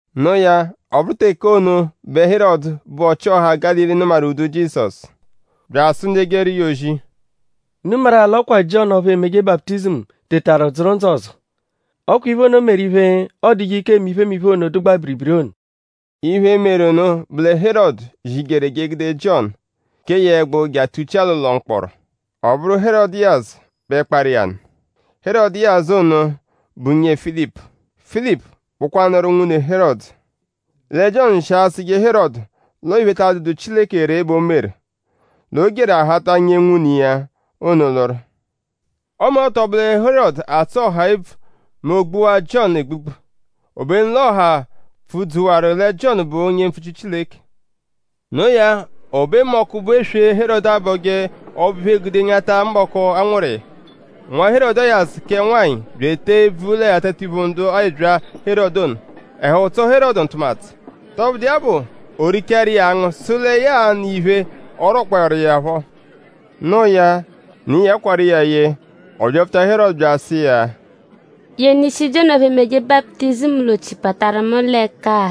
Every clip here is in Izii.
No iya; ọ bụru teke ono bẹ Herọdu, bụ ọchi-ọha Gálili nụmaru ụ́dù Jizọsu; bya asụ ndu ejeru iya ozi: “?Unu maru-a l'ọ kwa Jiọnu ọphu emeje baputizimu tetaru dzụru ndzụ ọzo; ọ kwa iphe ono meru iphe, ọoduje ike eme iphemiphe ono, dụgbaa biribiri ono.” Iphe, meru nụ bụ lẹ Herọdu zijeru; e je egude Jiọnu; kee ya ẹgbu je atuchia l'ụlo mkpọro. Ọ bụru Herọdiyasu bẹ kparụ iya nụ. Herọdiyasu ono bụ nyee Filipu. Filipu bụkwanuru nwune Herọdu. Lẹ Jiọnu shi asụje Herọdu l'ọo iphe, ta adụdu Chileke ree bẹ o meru; l'o jeru ahata nyee nwune iya ono lụru. Ọme ọ tọ bụwaa lẹ Herọdu atsụ ọha ebvu mẹ o gbuwaa Jiọnu egbugbu. Obenu l'ọha pfudzuwaru lẹ Jiọnu bụ onye mpfuchiru Chileke. Noo ya; o be mbọku, bụ eswe, Herọdu abọje Ọbo-iphe gude anyata mbọku, a nwụru iya; nwa Herọdiyasu kẹ nwanyị bya etee ebvu l'atatiphu ndu ẹbyaa Herọdu ono. Ẹhu tsọo Herọdu ntụmatu. Tọbudu iya bụ; o richaaru iya angụ sụ lẹ ya a-nụ iya iphe, ọ rwọkpoeru iya phọ. Noo ya; ne iya kwarụ iya ye. Ọ byapfuta Herọdu bya asụ iya: “Yenu ishi Jiọnu ọphu emeje baputizimu l'ochi pataru mu l'ẹka-a!”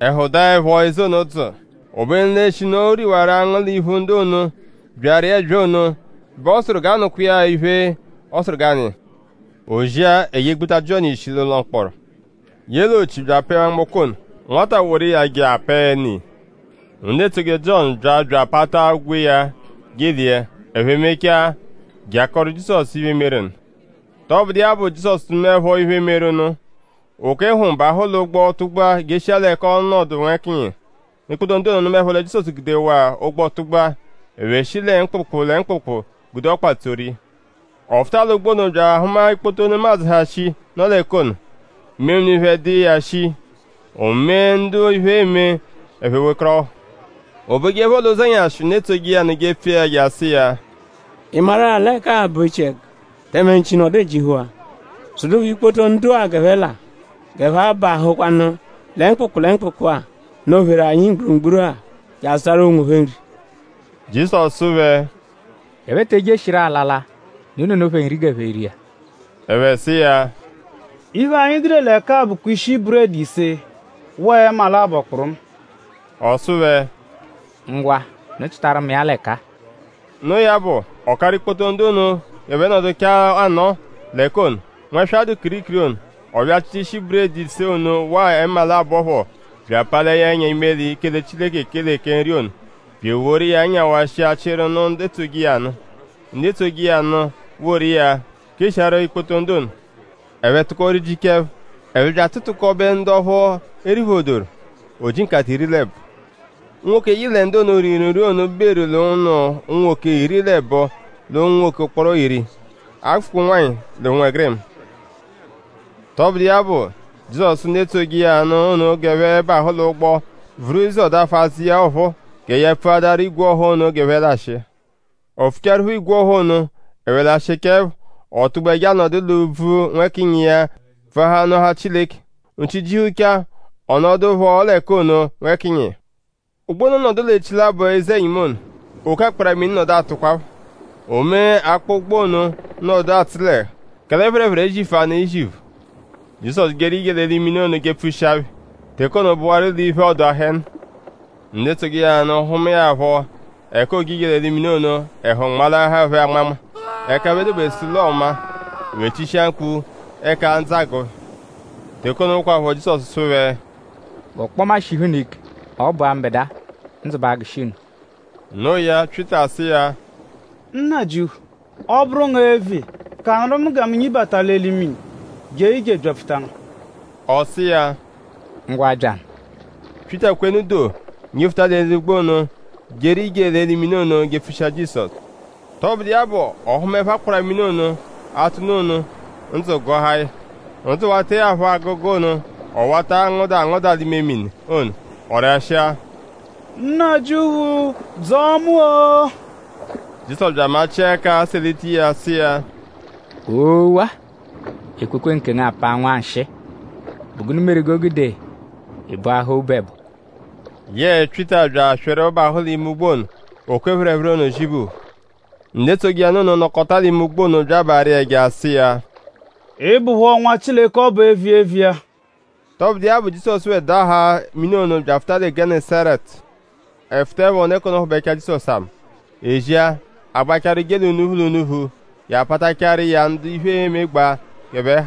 Ẹhu daẹpho eze ono dzụu. Obenu l'eshinu o riwaru angụ l'iphu ndu ono, byaru iya ẹbyaa ono bẹ ọ sụru g'a nụkwa iya iphe, ọ sụru g'a nụ iya. O zia; e je egbuta Jiọnu ishi l'ụlo mkpọro; ye l'ochi bya apẹe nwamgbọko ono. Nwata woru iya je apẹe ne iya. Ndu etsoje Jiọnu bya bya apata ogwe iya je elia. Ẹphe mechaa; je akọoru Jizọsu iphe, meru nụ. Tọbudu iya bụ; Jizọsu nụmaepho iphe, meru nụ; o kwe hm bahụ l'ụgbo tụgbua jeshia l'ẹka ọo-nọdu nwẹkiya. Ikpoto ndu ono nụmaepho lẹ Jizọsu gudewaa ụgbo tụgbua; ẹphe shi lẹ mkpụkpu lẹ mkpụkpu gude ọkpa tsoru iya. Ọ fụta l'ụgbo ono bya ahụma ikpoto nemadzụ, ha shii, nọ l'ẹka ono. Imemini phẹ dụ iya shii; o mee ndu iphe eme; ẹphe wekọrohu. O bejeẹpho l'ụzenyashi ndu etsoje iya nụ jepfu iya je asụ iya: “?Ị maru-a l'ẹka-a bụ echiẹgu; tẹme nchi nọdu ejihuwaa? Sụdupho ikpoto ndu-a g'ẹphe laa; g'ẹphe abahụkwanu lẹ mkpụkpu lẹ mkpụkpu-a, nọ-pheru anyi mgburugburu-a je azụtaru onwophẹ nri.” Jizọsu sụ phẹ: “G'ẹphe te ejeshirọ alala. Unu nụnu phẹ nri g'ẹphe ria.” Ẹphe sụ iya: “Iphe, anyi gude l'ẹka-a bụkwa ishi buredi ise waa ẹma labọ kpụrumu.” Ọ sụ phẹ: “Ngwa; unu chịtaru mu iya l'ẹka-a.” Noo ya bụ; ọ karụ ikpoto ndu ono g'ẹphe nọduchaa anọo l'ẹka ono, nwẹswa dụ kirikiri ono. Ọ bya achịta ishi buredi ise ono waa ẹma labọ phọ; bya apalia ẹnya imeli; kele Chileke ekele kẹ nri ono; bya eworu iya nyawashia chịru nụ ndu etsoje iya nụ. Ndu etsoje iya nụ woru iya keshiaru ikpoto ndu ono. Ẹphe tụko rijichaa ẹpho. Ẹphe bya atụtukobe ndu ọphu e riphodoru. O ji nkata iri l'ẹbo. Unwoke, yị lẹ ndu ono, riru nri ono beru l'ụnu unwoke iri l'ẹbo l'unwoke ụkporo iri; a -gụfukwa ụnwanyi l'ụnwegirima. Tọbudu iya bụ; Jizọsu sụ ndu etsoje iya nụ ono g'ẹphe bahụ l'ụgbo; vuru iya ụzo dafụ azụ iya ọphuu gẹ ya pfuadaru igwe ọha ono g'ẹphe lashịa. O pfuchaẹrupho igwe ọha ono; ẹphe lashịchaepho; ọ tụgbua je anọdu l'úbvú nwẹkinyi iya pfuahaa nụahaa Chileke. Nchi jihuchaa; ọ nọdu phọ l'ẹka ono nwẹkinyi iya. Ụgbo ono nọdu l'echilabọ eze-ẹnyimu ono. Oke akpara-mini nọdu atụkwapho. O mee akpọ ụgbo ono nọdu atsụ l'ẹhu; kẹle phẹrephere ezifuanụ iziphu. Jizọsu jeru ije l'eli mini ono jepfushia phẹ. Teke ono bụwaru l'iphe-ọduu aha ẹnu. Ndu etsoje iya nụ hụmae ya phọ; ẹka ooje ije l'eli mini ono; ẹhu nmalahaa phẹ anmanma; ẹka ẹphe dobesu l'ọo maa. Ẹphe chishia mkpu; ẹka ndzụ agụ phẹ. Teke ono kwaphọ; Jizọsu sụ phẹ: “G'ọkpoma shihu unu ike. Ọ bụa mbẹdua. Ndzụ ba agụshi unu.” Noo ya; Pyịta sụ iya: “Nnajịuphu; ọ -bụru ngu eviya; kanụru mu gẹ mu nyibata l'eli mini jee ije byapfuta ngu.” Ọ sụ iya: Ngwa! Byanụ! Pyịta kwenu do; nyifuta l'eli ụgbo ono jeru ije l'eli mini ono jepfushia Jizọsu. Tọbudu iya bụ; ọ hụmaepho akpara-mini ono, atụ nụ ono; ndzụ gụahaa ya. Ndzụ wataẹ ya phọ agụgu ono; ọ wata angụda angụda lẹ mini ono. Ọ rashịa: “Nnajịuphu dzọo mu-o!” Jizọsu bya amachịa ẹka selita iya sụ iya: “Oo-wa! Ekwekwe nkengu apaa nwanshịi.?Bụ gụnu meru g'o gude ị bọahaa obu ẹbo?” Yẹe Pyịta bya aswịru bahụ l'ime ụgbo ono. Oke phẹrephere ono zibuhu. Ndu etsoje iya nụ ono, nọkota l'ime ụgbo ono bya abaarụ iya ẹja sụ iya: “Ị bụpho Nwa Chileke ọbu eviya eviya.” Tọbudu iya bụ; Jizọsu phẹ daghaa mini ono bya afụta lẹ Gẹnesaretu. Ẹphe fụtaepho; ndu ẹka ono hụbechawaa Jizọsu ama. E zia; a gbachaaru je l'unuphu l'unuphu je apatachaaru iya ndu iphe emegbaa g'ẹphe ha.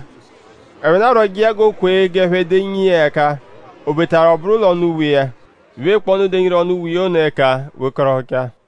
Ẹphe nọdu arwọje iya g'o kwe g'ẹphe denyi iya ẹka; obetaru ọ bụru l'ọnu uwe iya. Iphe, bụkpoo ndu denyiru ọnu uwe iya ono ẹka wekọrohuchaa.